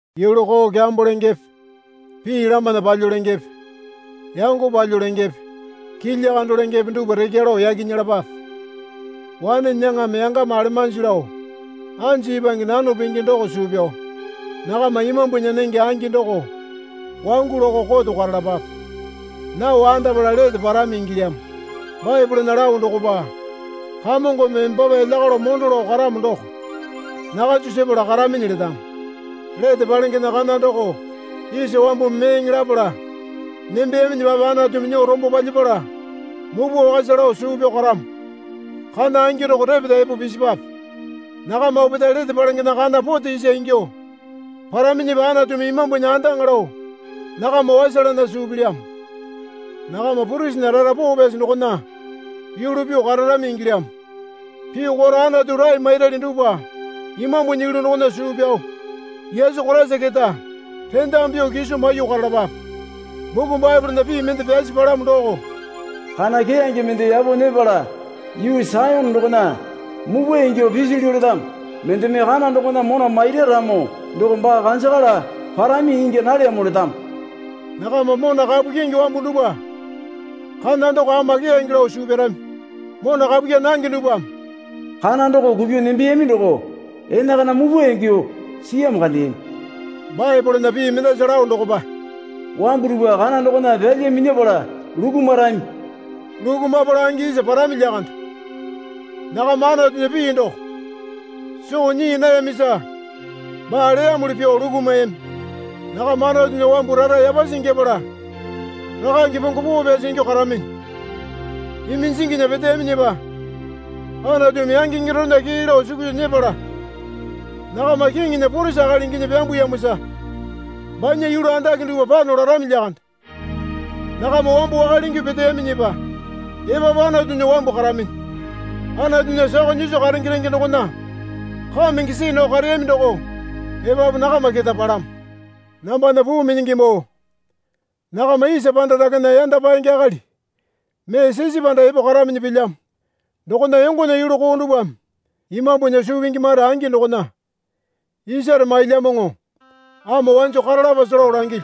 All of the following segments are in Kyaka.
Yulu koo kyambo lengepe pii lamana palyuo lengepe yango palyuo lengepe kilya kando lengepe dupwa rekya lao yaki nyelapape. Wane nyaŋame yangama alemanji lao anju ipwange nano pingi doko suu pyao nakama Imambunya nenge angi doko wangu lakao koto karalapape. Nao andapala lete parami ingilyamo. Baepolena lao dokopa, Kamongome embapa elya kalo mondo lao karamo doko nakanjo sepala karaminyi letamo. Lete palengena kana doko isa wambumi meeŋe lapala nembeyaminyipape Anatumi nyuo rombo palyapala mupwa wakasa lao suu pyao karamo. Kana angi doko repeta epo pisipwape. Nakama opetae lete palengena kana pote isa ingyuo paraminyipa Anatumi Imambunya andaŋa lao nakama wasalana suu pilyamo. Nakama purisinya rara poo pyasi dokona yulu pyuo kararami ingilyamo. Pyuo karo Anatu rae mairali dupwa Imambunya yulu dokona suu pyao Yesu Koraisa keta rendamu pyuo kiso maiyuo karalapape. Buku Baepolena pii mende pyasi palamo doko, Kana keyange mende yapo nyepala yuu Sayone dokona mupwa ingyuo pisilyu letamo. Mendeme kana dokona mona maira ramo doko baa kanjakala parami ingya nalyamo letamo. Nakama mona kapu kyingi wambu dupwa kana doko ama keyange lao suu pyarami. Mona kapu kyaa nange dupwame, Kana doko kupyuo nembeyami doko enakana mupwa ingyuo siyamo kandeyami. Baepolena pii mendasa lao dokopa, Wambu dupwa kana dokona pyalya minyapala lukumwarami. Lukumapala angi isa parami lyakande. Nakama Anatunya pii doko soo nyii nayamisa baa leyamuli pyuo lukumayami. Nakama Anatunya wambu rara yapasi ingyapala rakange pongo poo pyasi ingyuo karaminyi. Iminjinginya peteyaminyipa Anatumi yangaenge dorena kee lao sukusa nyepala nakama Kiŋinya purisi akali inginyi pyambuyamosa banya yulu andake dupwa pano larami lyakande. Nakamba wambo wakale ingyuo peteyamiyipa epapu Anatunya wambu karaminyi. Anatunya sakao nyiso karenge renge dokona kamenge see nao kareyami doko epapu nakama kete palamo. Nambana puu minyingimoo. Nakama isa panda dakena yanda paenge akali mee sisipanda epo karaminyi pilyamo. Dokona yongonya yulu koo dupwame imambunya suu pingi mare angi dokona isare mailyamoŋo ama wanjo karalapase lao langilyu.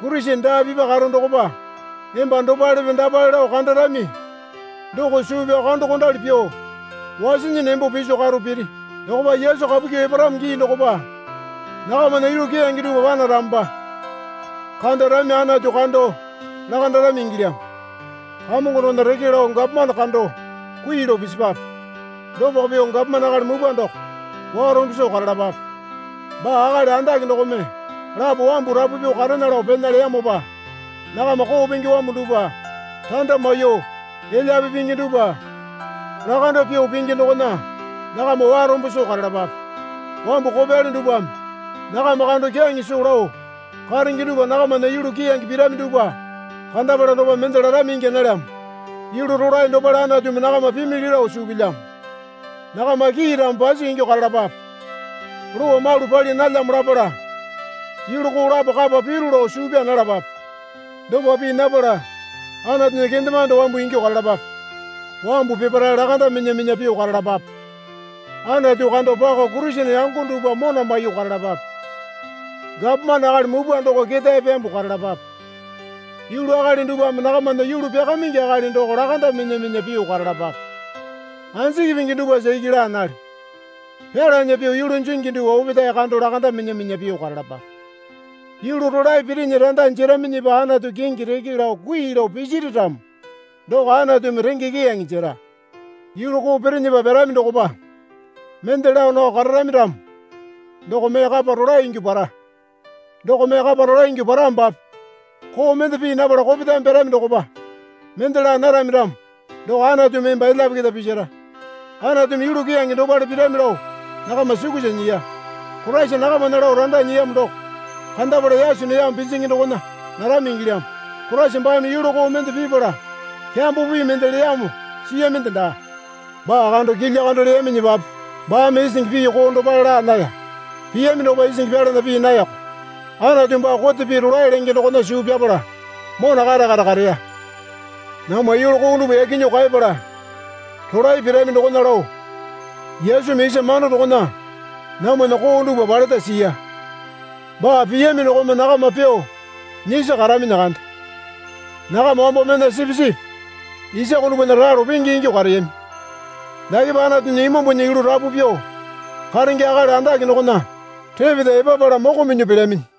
Kurisene daa pipa karo dokopa emba dopalepe dapale lao kandarami doko suu pyao kandokondali pyuo wasinyi nembo piso karo piri. Dokopa Yesu kapu kyuo eparamo gii dokopa nakamana yulu keyange dupwa panaramopa kandarami Anatu kando lakandarami ingilyamo. Kamongo dokona reke lao gapomane kando kui lao pisipwape. Dopako pyuo gapomane akali mupwa doko warombo soo karalapape. Baa akali andake dokome lapo wambu rapu pyuo karena lao pena leyamopa nakama koo pingi wambu dupwa randa maiyuo, elyape pingi dupwa lakando pyuo pingi dokona nakama warombo soo karalapape. Wambu kopyali dupwame nakama kando kyaŋe soo lao karenge dupwa nakamana yulu keyange pirami dupwa kandapala dokopa mende larami ingya nalyamo yulu rolae dopale Anatumi nakama pimili lao suu pilyamo. Nakama kiiramo pasi ingyuo karalapape. Lowa malu pali nalyamo lapala yulu koo lapo kapa piru lao suu pyaa nalapape. Dopa pii napala Anatunya kendemande wambu ingyuo karalapape. Wambu peparae lakanda minya minya pyuo karalapape. Anatu kando pako Kurisene yango dupwa mona maiyuo karalapape. Gapomane akali mupwa doko ketae pyambuo karalapape. Yulu akali dupwame nakamana yulu pyakamaingi akali doko lakanda minya minya pyuo karalapape. Anjiki pingi dupwasa iki laa nalyo. Pyalana pyuo yulu jingi dupwa opetae kando lakanda minya minya pyuo karalapape. Yulu rolae pirinyi randa jeraminyipa Anatunya kingi reke lao kui lao pisiri ramo doko Anatumi renge keyange jera. Yulu koo pirinyipa pyarami dokopa mende laa nao kararami ramo doko mee kapa rolae ingyuo para. Doko mee kapa rolae ingyuo paramopape koo mende pii napala kopetame pyarami dokopa mende laa narami ramo doko Anatumi emba elyape keta pisara. Anatumi yulu keyange dopale pirami lao nakama sukusa nyiya. Koraisa nakamana lao randa nyiyamo doko kandapala yaso neyamo pinjingi dokona narami ingilyamo. Koraisa baame yulu koo mende pipala kyambo pii mende leyamo siyaminde daa. Baa kando kilya kando leyaminyipape baame isingi pii koo dopale laa naya. Piyami dokopa isingi pyalana pii nayako. Anatu baa kote pii rolae lenge dokona suu pyapala mona kare kare kareya. Namwa yulu koo dupwa yaki nyuo kaeyapala rolae pirami dokona lao Yesumi isa mamando dokona namwana koo dupwa paleta siya. Baa piyami dokome nakama pyuo nyisi karaminyi kande. Nakama wambo mena sipisipi isako dupwana ralo penge ingyuo kareyami. Dakepa Anatunya Imambunya yulu rapu pyuo karenge akali andake dokona repeta epapala moko minyuo pelyaminyi.